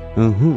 Ỹhỹ,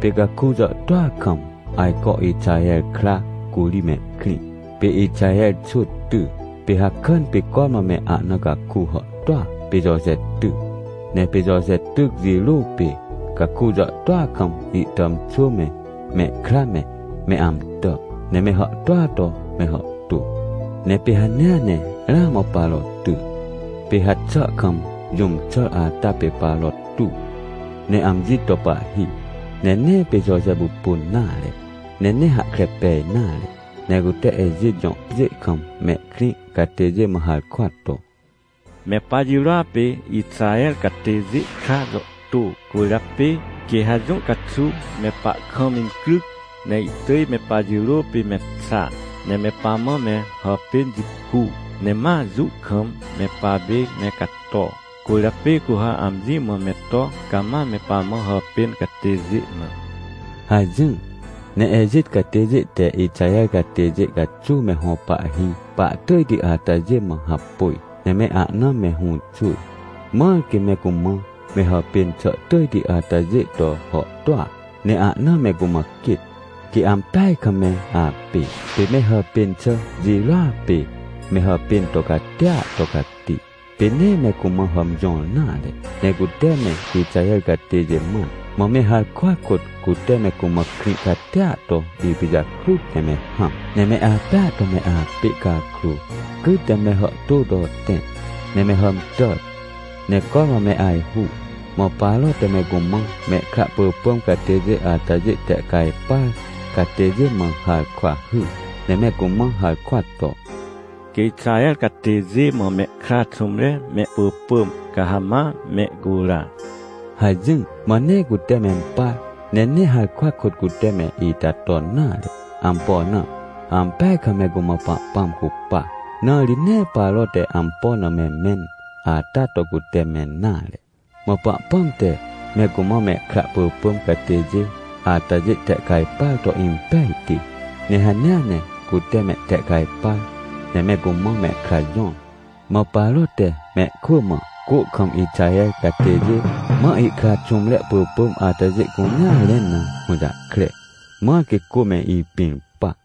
pê caku jàhtôa kam, ajco Ixaher kra curi mehkrĩ. Pê Ixaher xwỳ ty, pê hakàn pê cormã me ahna cakuhàhtôa pê Joje ty. Ne pê Joje tyc jirô pê, caku jàhtôa kam ihtàmxwỳme, mehkra me, me amtà, ne me hàhtôa to me hàhtô. Ne pê hanea ne ramã Paro ty. Pê haxà kam jũm xàr ata pê Paro tuw, ne amji to pahhi. Ne nee pê Joje pupun nare, ne nee hahkre pej nare. Ne cute Ejit jõ pjê kam mehkrĩcatêjê mã harkwa to: — Me pajirôa pê Ixaher catêjê kra jàhtô, cwỳrjapê quê ha jũ caxuw me pahkamincryc, ne ihtỳj me pajirô pê me xa, ne me pamã me hàpên jicu, ne ma jũ kam me papême cato. Cwỳrjapê cu ha amji mã me to cama me pamã hàpêncatêjê na — hajỹr. Ne Ejit catêjê te Ixaher catêjê caxuw me hõ pahhi pahtỳjtiatajê mã hapôj, ne me ahna me hũxwỳr, mãr quê me cumã me hàpên xàtỳjti atajê to hàhtôa, ne ahna me cumã quêt, quêampeaj kam me apê. Pê me hàpên xà jirôa pê me hàpên to catia to cati, pê nee me cumã hàmjõr nare. Ne cute me Ixaher catêjêmãn, mã me harkwa kôtcute me cumã krĩ catia to ipijakrut ne me hãm. Ne me apêa to me apê cakrô, cyt ne mehàhtô to tẽ ne me hàmtàr, ne cormã me ajhu. Mã Paro te me cumãmehkra pỳpỳm catêjê atajê tehcajpar catêjê mã harkwahyr, ne me cumã harkwa to: — Quê Ixaher catêjê mã mehkra xũmre mehpỳpỳm, ca ha ma mehcura — hajỹr. Mã nee cute mempar, ne nee harkwa kôt cute me ita ton nare. Ampo na? Ampeajkam me cumã Pahpãm cupa, na ri nee Paro te ampo na me mẽn ata to cuteme nare. Mã Pahpãm te me cumã mehkra pỳpỳm catêjê atajê tehcajpar to impejti, ne hanea ne cute mehtehcajpar, ne me cumã mehkra jõr. Mã Paro te mehkwỳ mã, cô kam Ixaher catêjê mã ihkra xũmre pỳpỳmatajê cunea rẽn na hũjahkre, mãr quê cô me ipĩr pa.